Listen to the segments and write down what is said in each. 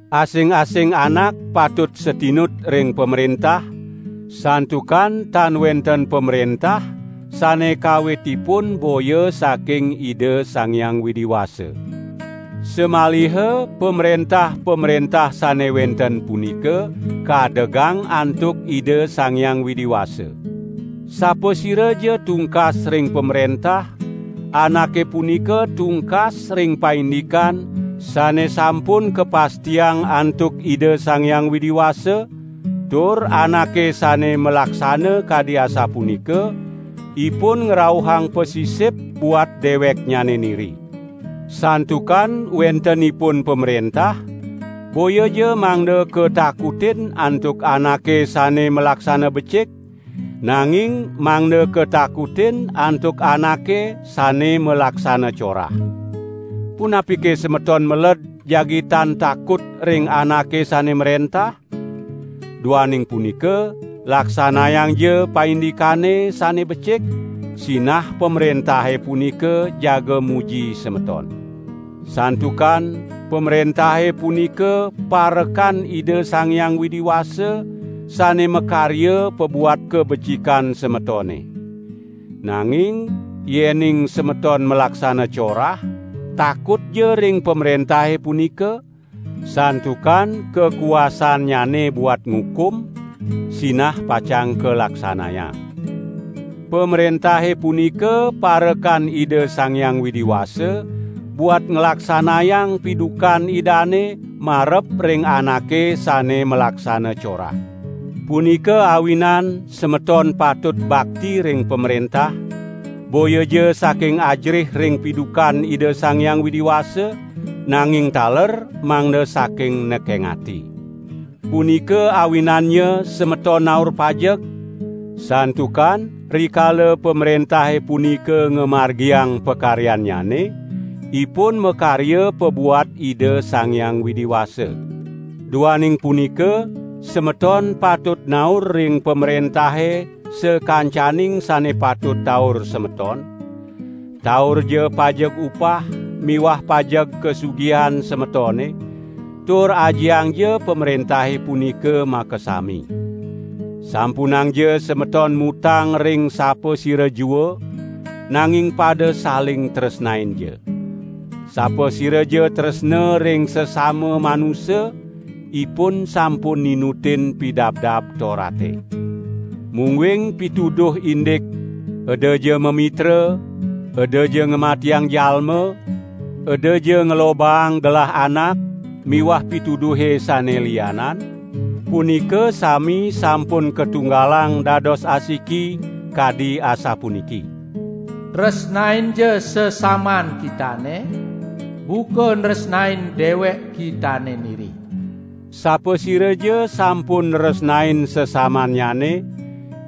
Asing-asing anak patut satinut ring pamrentah, santukan tan wenten pamrentah sane kawitipun boya saking Ida Sang Hyang Widi Wasa. Samaliha pamrentah-pamrentah sane wenten punika kadegang antuk Ida Sang Hyang Widi Wasa. Sapasiraja tungkas ring pamrentah, anake punika tungkas ring paindikan sane sampun kapastiang antuk Ida Sang Hyang Widi Wasa, tur anake sane malaksana kadi asapunika, ipun ngrauhang pasisip buat deweknyane niri. Santukan wentenipun pamrentah, boyaja mangda katakutin antuk anake sane malaksana becik, nanging mangda katakutin antuk anake sane malaksana corah. Punapike semeton meled jagi tan takut ring anake sane mrentah? Duaning punika laksanayangja paindikane sane becik, sinah pamrentahe punika jaga muji semeton. Santukan pamrentahe punika parekan Ida Sang Hyang Widi Wasa sane makarya pabuat kabecikan semetone. Nanging yening semeton malaksana corah, takutja ring pamrentahe punika, santukan kakuasaannyane buat ngukum, sinah pacang kalaksanayang. Pamrentahe punika parekan Ida Sang Hyang Widi Wasa buat nglaksanayang pidukan Idane marep ring anake sane malaksana corah. Punika awinan semeton patut bakti ring pamrentah, boyaja saking ajerih ring pidukan Ida Sang Hyang Widi Wasa, nanging taler mangda saking nekeng ati. Punika awinannya semeton naur pajeg, santukan rikala pamrentahe punika ngamargiang pakaryannyane, ipun makarya pabuat Ida Sang Hyang Widi Wasa. Duaning punika semeton patut naur ring pamrentahe sakancaning sane patut taur semeton; taurja pajeg upah miwah pajeg kasugihan semetone, tur ajiangja pamrentahe punika makasami. Sampunangja semeton mutang ring sapasira jua, nanging pada saling tresnainja. Sapasiraja tresna ring sesama manusa, ipun sampun ninutin Pidabdab Torate. Mungguing pituduh indik: Edaja mamitra, edaja ngamatiang jalma, edaja nglobaang gelah anak miwah pituduhe sane lianan, punika sami sampun katunggalang dados asiki, kadi asapuniki: "Tresnainja sesaman kitane buka nresnain dewek kitane niri." Sapasiraja sampun nresnain sesamannyane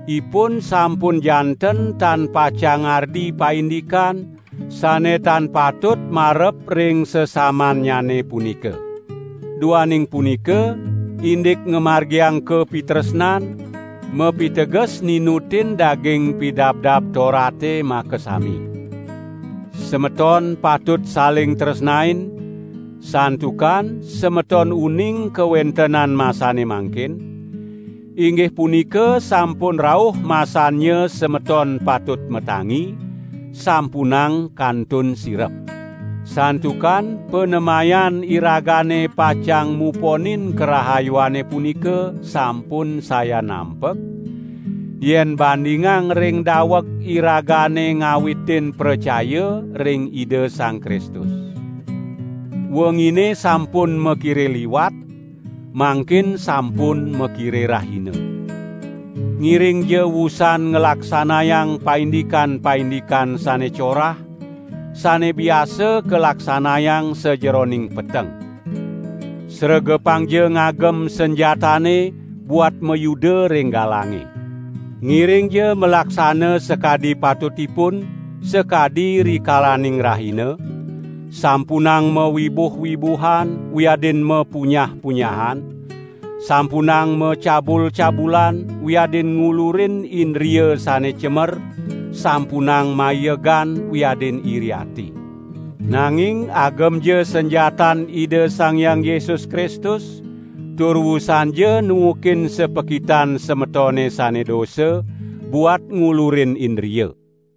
ipun sampun janten tan pacang ngardi paindikan sane tan patut marep ring sesamannyane punika. Duaning punika, indik ngamargiang kapitresnan, mapiteges ninutin daging Pidabdab Torate makasami. Semeton patut saling tresnain, santukan semeton uning kawentenan masane mangkin; inggih punika sampun rauh masannya semeton patut matangi, sampunang kantun sirep. Santukan panemayan iragane pacang muponin karahayuane punika sampun sayan nampek, yen bandingang ring daweg iragane ngawitin pracaya ring Ida Sang Kristus. Wengine sampun makire liwat, mangkin sampun makire rahina. Ngiringja wusan nglaksanayang paindikan-paindikan sane corah, sane biasa kalaksanayang sajeroning peteng. Sregepangja ngagem sanjatane buat mayuda ring galange. Ngiringja malaksana sakadi patutipun, sakadi rikalaning rahina; sampunang mawibuh-wibuhan wiadin mapunyah-punyahan, sampunang macabul-cabulan wiadin ngulurin indria sane cemer, sampunang maiegan wiadin iri ati. Nanging agemja sanjatan Ida Sang Hyang Yesus Kristus tur wusanja nuukin sapakitan semetone sane dosa, buat ngulurin indria.